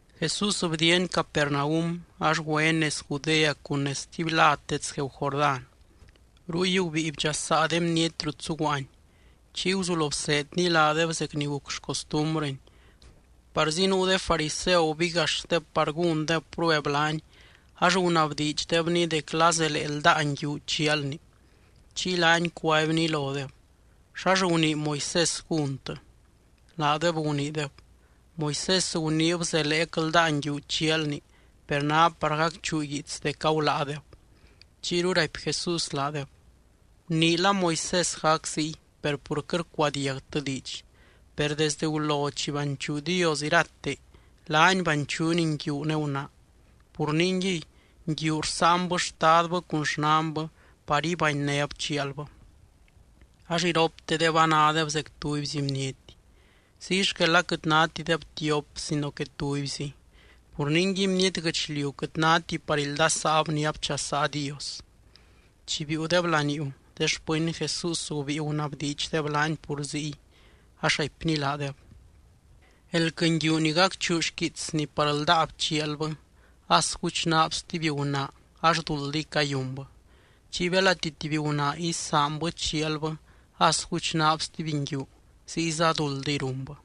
Jesús bdiiany Capernaum ax güeny nez Judea cun nez stuby lad dets gueeu Jordán. Ruy gubíi bdxasaa de bniety rut zuguaany. Chiy guzulo bseedny laadeb zec ni guc xcostumbrɨny. Parzi nuu de fariseu gubigaxdeb par gúndeb prueb laany ax gunabdiidxdebny dec la zelee ldáa nguiu chialni. Chiy laany cuaibny lodeb: —¿Xax gunii Moisés gúntɨ? Laadeb guniideb: —Moisés guniib zeleec ldáa nguiu chialni, per ná par gacchuu guiits dec aguláadeb. Chiyru raipy Jesús laadeb: —Guniila Moisés gac ziy per pur quɨt rcuadiagtɨ diidx. Per desdɨ gulo chi banchuu Dios irate, “laany banchuuny nguiu ne gunaa.” “Pur ningui, nguiu rsáanbɨ xtadbɨ cun xnanbɨ par ibanynéb chialbɨ ax iroptedeb anádeb zec tubyzi bniety.” Ziy xquel aquɨt nátideb tiop sino que tubyzi. Pur ningui, bniety guɨchliu quɨt náti par ildasaab ni abchasaa Dios. Chi biiudeb laniuu, de xpɨny Jesús gubíi gunabdiidxdeb laany pur ziy, ax raipny laadeb: —Elquɨ nguiu ni gacchuu xquiitsni par ldáab chialbɨ as guchnaab stuby gunaa ax duldiy cayunbɨ. Chiy belati tuby gunaa isaanbɨ chialbɨ as guchnaab stuby nguiu, ziyza duldiy runbɨ.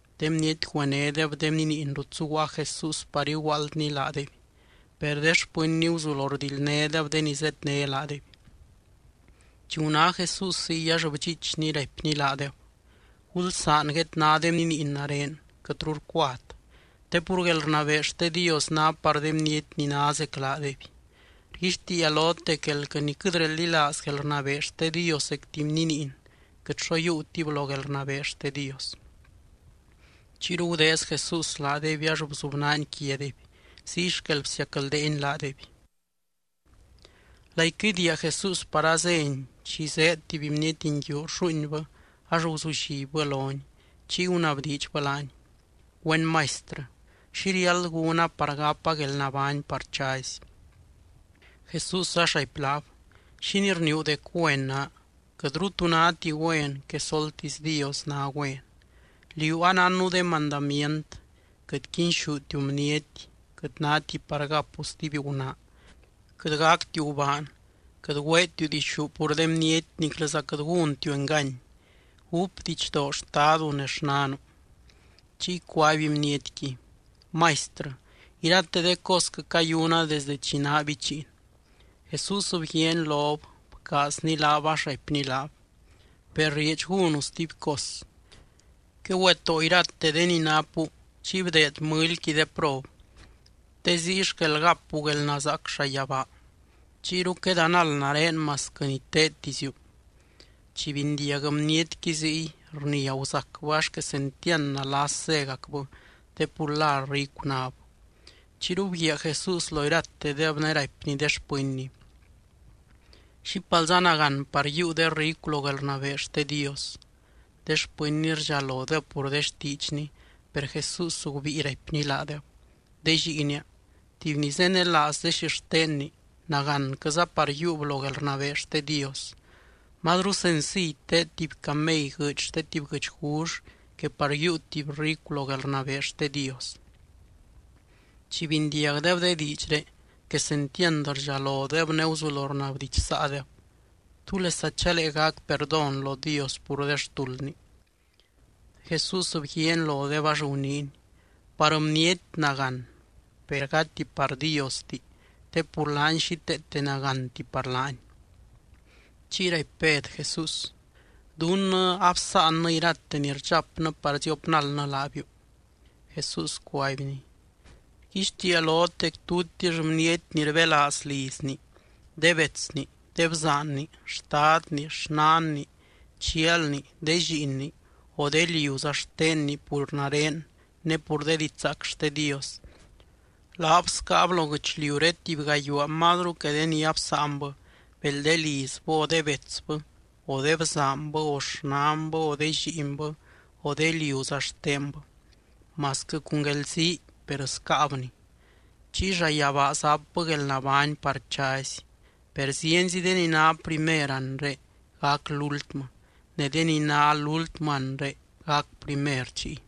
De bniety güenédeb de bniniin rut zuguaa Jesús par iguaaldny laadeby. Per de xpɨnny guzulo rdildnédeb de ni zedné laadeby. Chi guná Jesús ziy, ax bdxiichny, raipny laadeb: —Gulsaan guedná de bniniin nare, quɨtru rcuat. Te pur guelrnabee xte Dios ná par de bniety ni ná zec laadeby. Rguixtiia lot dec elquɨ ni quɨt reldilaaz guelrnabee xte Dios zec tuby bniniin, quɨt xo yiiutib lo guelrnabee xte Dios. Chiyru gudeez Jesús laadeby ax bzubnaany quiadeby. Ziy xquel bsiacldeeny laadeby. Laiquɨ idiia Jesús par azény, chi zéed tuby bniety nguiu rlluuinbɨ ax guzullibbɨ lony. Chiy gunabdiidxbɨ laany: —Güen Maistrɨ, ¿xi riáld gúna par gapa guelnabány par chazy? Jesús ax raipy laab: —¿Xínii rniiu dec güen naa? Quɨtru tu náti güen, quesoltisy Dios ná güen. Liú anánnu de mandamient: “Quɨt quinxútiu bniety. Quɨt náti par gapu stuby gunaa. Quɨt gactiu gubaan. Quɨt güeetiu dixú pur de bniety niclɨza quɨt gúntiu engany. Gúp didxdoo xtadu ne xnanu.” Chiy cuaby bnietqui: —Maistrɨ, irate de cosquɨ cayuna desde chi naa bichiin. Jesús bguiaany lob, bcaazny laab ax raipny laab: —Per rieedx gúnu stuby cos: Quegüetóo irate de ni napu chiy bdeed mɨlyqui de prob, te ziy xquel gapu guelnazaac llayabaa. Chiyru quedanald nare masquɨ ni teedtiziu. Chi bindiag bnietqui ziy, rnia guzacbɨ ax quesentiand nalas zégacbɨ te pur la ricu náb. Chiyru bguiaa Jesús lo iratedeb ne raipny de xpɨnny: —¡Xípalza nagán par yiiu de ricu lo guelrnabee xte Dios! De xpɨnny rdxalodeb pur de xtiidxny. Per Jesús gubíi raipny laadeb: —De lliinia, tuby ni zenelaaz de xixtenni, ¡nagánquɨza par yiiub lo guelrnabee xte Dios! Mazru senciy teed tuby camey guɨɨdy xte tuby guɨchgull que par yiiu tuby ricu lo guelrnabee xte Dios. Chi bindiagdeb de diidxré, quesentiand rdxalodeb ne guzulo rnabdidxsaadeb: —¿Túlesa chalee gac perdón lo Dios pur de xtuldni? Jesús bguiaany lodeb ax guniiny: —Par bniety nagán, per gati par Diosti, te pur laany xíteete nagánti par laany. Chiy raipy Bed Jesús: —Dunnɨ absáannɨ irate ni rdxapnɨ par ziopnaldnɨ laabiu. Jesús cuaibny: —Rguixtiia lot dec tutix bniety ni rbelaaz lizni, de betsni, de bzaanni, xtadni, xnanni, chialni, de lliinni, o de liuza xtenni pur nare ne pur de didxzaac xte Dios, laab scaab lo guɨchliuré tuby gayuaa mazru que de ni absáanbɨ: bel de lizbɨ, o de betsbɨ, o de bzaanbɨ, o xnanbɨ, o de lliinbɨ, o de liuza xtenbɨ, masquɨ cun guelzii per scaabni. Chiy llayabaa zapbɨ guelnabány par chazy. Per zienzi de ni ná primer anre, gac lúltmɨ, ne de ni ná lúltmɨ anre, gac primer chiy.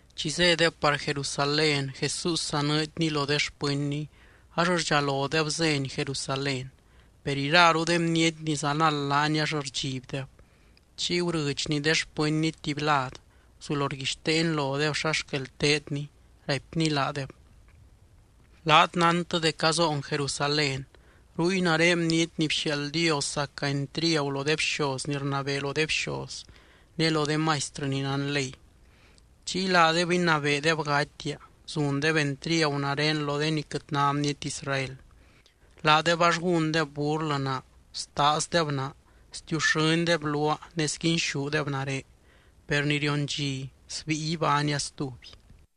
Chi zédeb par Jerusalén, Jesús zanɨɨdny lo de xpɨnny ax rdxalodeb zény Jerusalén, per iraru de bniety ni zanald laany ax rdxibdeb. Chiy gurɨdxny de xpɨnny tuby lad, guzulo rguixteeny lodeb xa xquel teedny. Raipny laadeb: —Laat nántɨ dec azoon Jerusalén, ruy nare Bniety ni bxiaald Dios zaca entriagu lo de bxoz ni rnabee lo de bxoz ne lo de maistrɨ ni nán ley. Chiy laadeb inabeedeb gatia, zundeb entriagu nare lo de ni quɨt ná bniety Israel. Laadeb ax gúndeb burlɨ naa, staazdeb naa, stiuxɨ́ndeb luaa ne sguinxúdeb nare. Per ni rion dxi, sbíi ibánia stuby.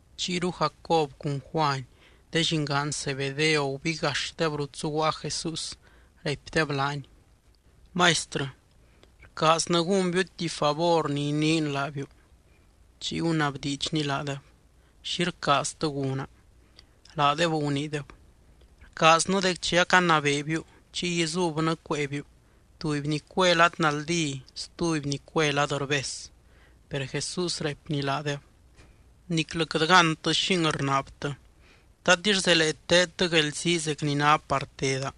Chiyru Jacob cun Juany de llingaan Zebedeo gubigaxdeb rut zuguaa Jesús, raipdeb laany: —Maistrɨ, rcaaznɨ gúnbiu tuby favor ni iniin laabiu. Chiy gunabdiidxny laadeb: —¿Xi rcaaztɨ gúna? Laadeb guniideb: —Rcaaznɨ dec chi acanabeebiu, chiy izubnɨ cueebiu, tuby ni cue lad naldí stuby ni cue lad rbes. Per Jesús raipny laadeb: —Niclɨ quɨt gántɨ xing rnaabtɨ. ¿Tatix zelee teedtɨ guelzii zec ni ná par teda?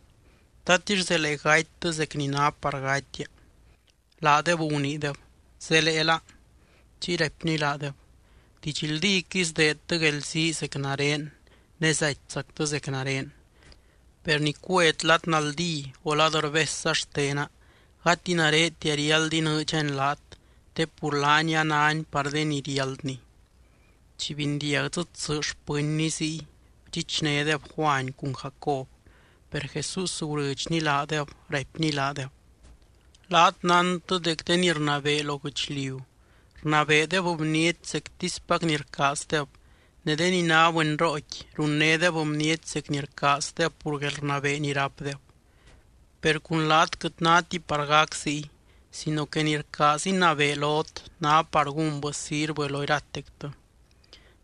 ¿Tatix zelee gatytɨ zec ni ná par gatia? Laadeb guniideb: —Zeleela. Chiy raipny laadeb: —Didxldíquɨy sdeedtɨ guelzii zec nare ne zatyzactɨ zec nare. Per ni cuet lad naldí o lad rbesza xtena, gati naretia riáld inɨɨdxani laat, te pur laani a náni par de ni riáldni. Chi bindiag dzɨ tsɨ xpɨnny ziy, bdxichnédeb Juany cun Jacob. Per Jesús gurɨdxny laadeb, raipny laadeb: —Laat nántɨ dec de ni rnabee lo guɨchliu, rnabeedeb bniety zectispac ni rcaazdeb, ne de ni ná bɨnrooqui, runnédeb bniety zec ni rcaazdeb pur guelrnabee ni rápdeb. Per cun laat quɨt náti par gac ziy, sino que ni rcaaz inabee lot, ná par gúnbɨ sirvɨ lo iratectɨ.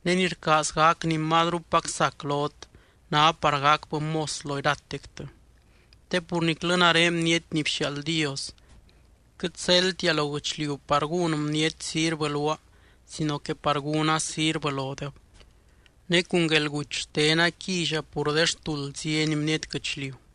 Ne ni rcaaz gac ni mazrupac sac lot, ná par gacbɨ mos lo iratectɨ. Te pur niclɨ nare Bniety ni bxiaald Dios, quɨt zeldtia lo guɨchliu par gún bniety sirvɨ luaa sino que par gúna sirvɨ lodeb, ne cun guelguty xtena quilla pur de xtuld zienzi bniety guɨchliu.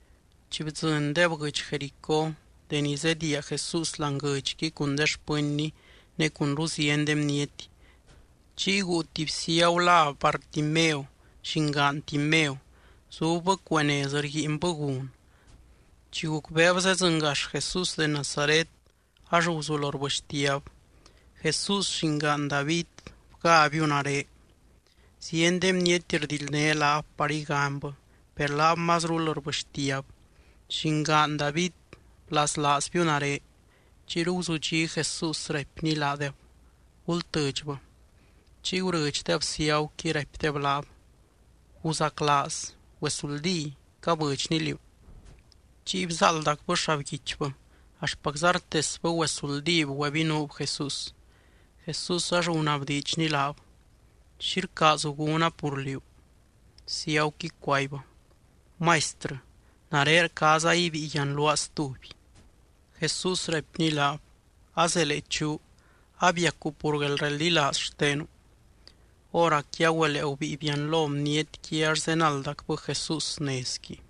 Chi bdzɨndeb guɨdx Jericó, deni zediia Jesús láani guɨdxqui cun de xpɨnny ne cunru zienzi de bniety, chiy guu tuby ciagu lá Bartimeo, llingaan Timeo. Zubbɨ cuee nez rguiinbɨ gun. Chi gucbeeb zedzɨngax Jesús de Nazaret, ax guzulo rbɨxtiab: —¡Jesús, Llingaan David, bgábiu nare! Zieny de bniety rdildné laab par iganybɨ, per laab mazrul rbɨxtiab: —¡Llingaan David, blaslaazbiu nare! Chiyru guzudxí Jesús, raipny laadeb: —Gultɨdxbɨ. Chiy gurɨdxdeb ciaguqui, raipdeb laab: —Guzaclaaz. Güesuldí, cabɨdxny liú. Chiy bzáaldacbɨ xabguichbɨ, axtpacza rtesbɨ güesuldíb güebinuub Jesús. Jesús ax gunabdiidxny laab: —¿Xi rcaazu gúna pur liú? Ciaguqui cuaibbɨ: —Maistrɨ, nare rcaaza ibíi yianluaa stuby. Jesús raipny laab: —Azelee chuu. Abiacu pur guelreldilaaz xtenu. Hóracqui agüelee gubíi bianlo bnietqui ax zenaldacbɨ Jesús nezqui.